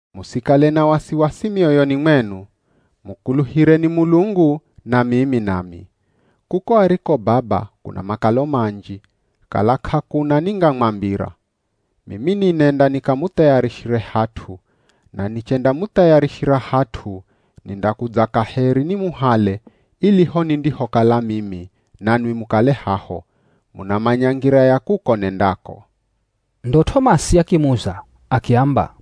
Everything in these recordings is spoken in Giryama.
“Musikale na wasiwasi mioyoni mwenu. Mukuluhireni Mulungu na mimi nami. Kuko ariko Baba kuna makalo manji, kala k'akuna ningamwambira. Mimi ninenda nikamuthayarishire hat'u, na nichendamuthayarishira hat'u, nindakudza kaheri nimuhale ili ho nindihokala mimi, nanwi mukale haho. Munamanya ngira ya kuko nendako.” Ndo T'omasi akimuza akiamba,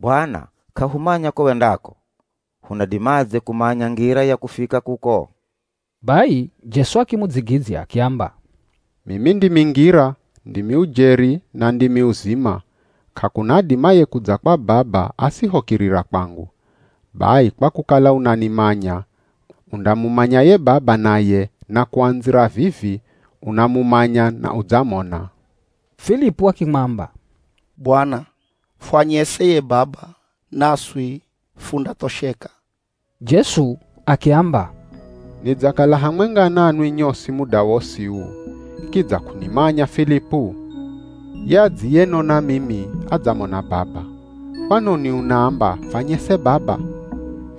“Bwana k'ahumanya ko wendako, hunadimadze kumanya ngira ya kufika kuko?” Bai Jesu akimudzigidzya akiamba, “Mimi ndimi ngira, ndimi ujeri na ndimi uzima, k'akuna adimaye kudza kwa Baba asihokirira kwangu. Bai kwa kukala unanimanya, undamumanya ye Baba naye na kuandzira vivi, unamumanya na udzamona.” Filipu akimwamba, “Bwana, fwanyese ye Baba naswi fundathosheka.” Jesu akiamba, “Nidzakala hamwenga nanwi nyosi muda wosi uu, kidza k'unimanya Filipu? Ye adziyenona mimi adzamona Baba. Kwanoni unaamba, ‘Fanyese Baba?’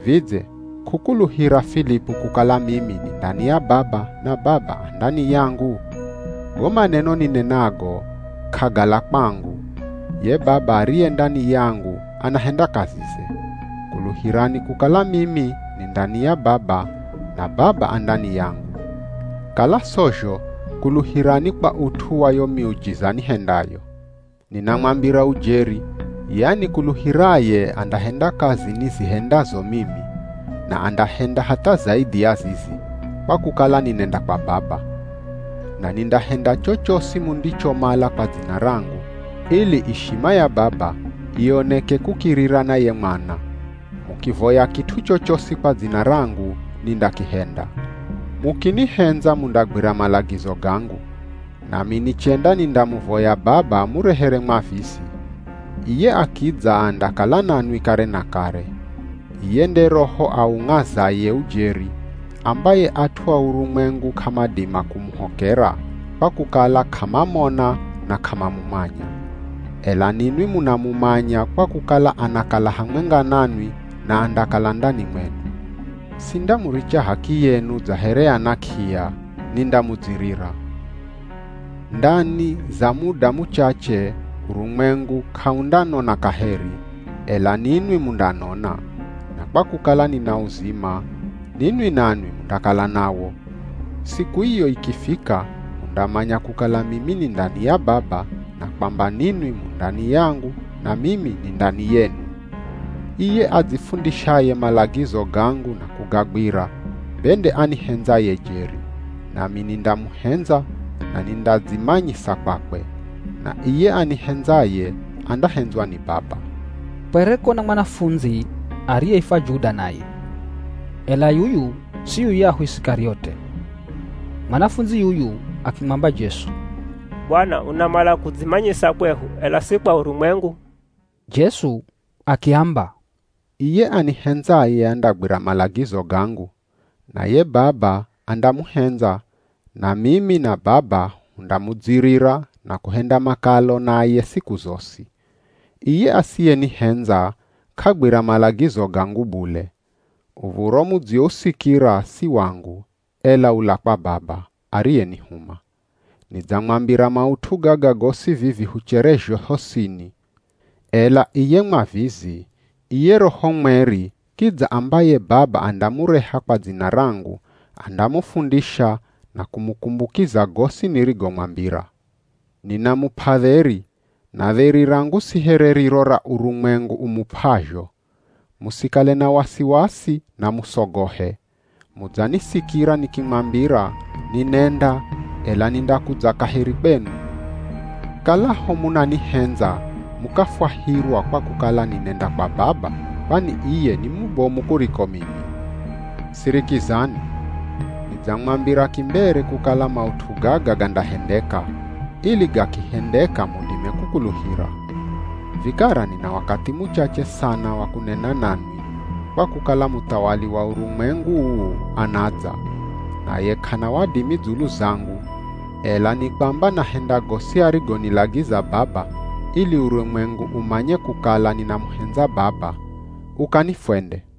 Vidze k'ukuluhira Filipu kukala mimi ni ndani ya Baba na Baba a ndani yangu? Go maneno ninenago k'agala kwangu. Ye Baba ariye ndani yangu anahenda kazize. Kuluhirani kukala mimi ni ndani ya Baba na Baba a ndani yangu. Kala sozho, kuluhirani kwa ut'u wa yo miujiza nihendayo. Ninamwambira ujeri ye anikuluhiraye andahenda kazi nizihendazo mimi, na andahenda hatha zaidhi ya zizi, kwa kukala ninenda kwa Baba. Na nindahenda chochosi mundichomala kwa dzina rangu, ili ishima ya Baba ioneke kukirira na ye Mwana. Mukivoya kit'u chochosi kwa dzina rangu nindakihenda.” “Mukinihendza mundagwira malagizo gangu. Nami nichenda nindamuvoya Baba amurehere Mwavizi. Iye akidza andakala nanwi kare na kare. Iye nde Roho aung'azaye ujeri, ambaye at'u a urumwengu k'amadima kumuhokera, kwa kukala k'amamona na k'amamumanya. Ela ninwi munamumanya kwa kukala anakala hamwenga nanwi na andakala ndani mwenu. Sindamuricha h'akiyenu dza here ana k'iya, nindamudzirira. Ndani za muda muchache urumwengu k'aundanona kaheri, ela ninwi mundanona, na kwa kukala nina uzima, ninwi nanwi mundakala nawo. Siku iyo ikifika, mundamanya kukala mimi ni ndani ya Baba na kwamba ninwi mu ndani yangu na mimi ni ndani yenu. Iye adzifundishaye malagizo gangu na kugagwira be nde anihendzaye jeri, nami nindamuhendza na nindadzimanyisa kwakwe. Na iye anihendzaye andahendzwa ni Baba.” Kwereko na mwanafundzi ariyeifwa Juda naye, (ela yuyu si yuyahu Isikariote). Mwanafundzi yuyu akimwamba Jesu, “Bwana unamala kudzimanyisa kwehu, ela si kwa urumwengu?” Jesu akiamba, “Iye anihendzaye andagwira malagizo gangu. Naye Baba andamuhendza, na mimi na Baba hundamudzirira na kuhenda makalo naye siku zosi. Iye asiyenihendza, k'agwira malagizo gangu bule. Uv̱oro mudziousikira si wangu, ela ula kwa Baba ariyenihuma. “Nidzamwambira maut'u gaga gosi vivi hucherezho hosini. Ela iye Mwavizi, iye Roho Mweri kidza, ambaye Baba andamureha kwa dzina rangu, andamufundisha na kumukumbukiza gosi nirigomwambira. Ninamup'a dheri, na dheri rangu si here riro ra urumwengu umup'azho. Musikale na wasiwasi na musogohe. Mudzanisikira nikimwambira, ‘Ninenda, ela nindakudza kaheri kwenu.’ Kalaho munanihendza mukafwahirwa kwa kukala ninenda kwa Baba, kwani iye ni mubomu kuriko mimi. Sirikizani! Nidzamwambira kimbere kukala maut'u gaga gandahendeka, ili gakihendeka mudime kukuluhira. Vikara nina wakathi muchache sana wa kunena nanwi, kwa kukala muthawali wa urumwengu uu anadza. Naye k'ana wadimi dzulu zangu, ela nikwamba nahenda gosi arigonilagiza Baba ili urumwengu umanye kukala ninamuhendza Baba. Ukani fwende.”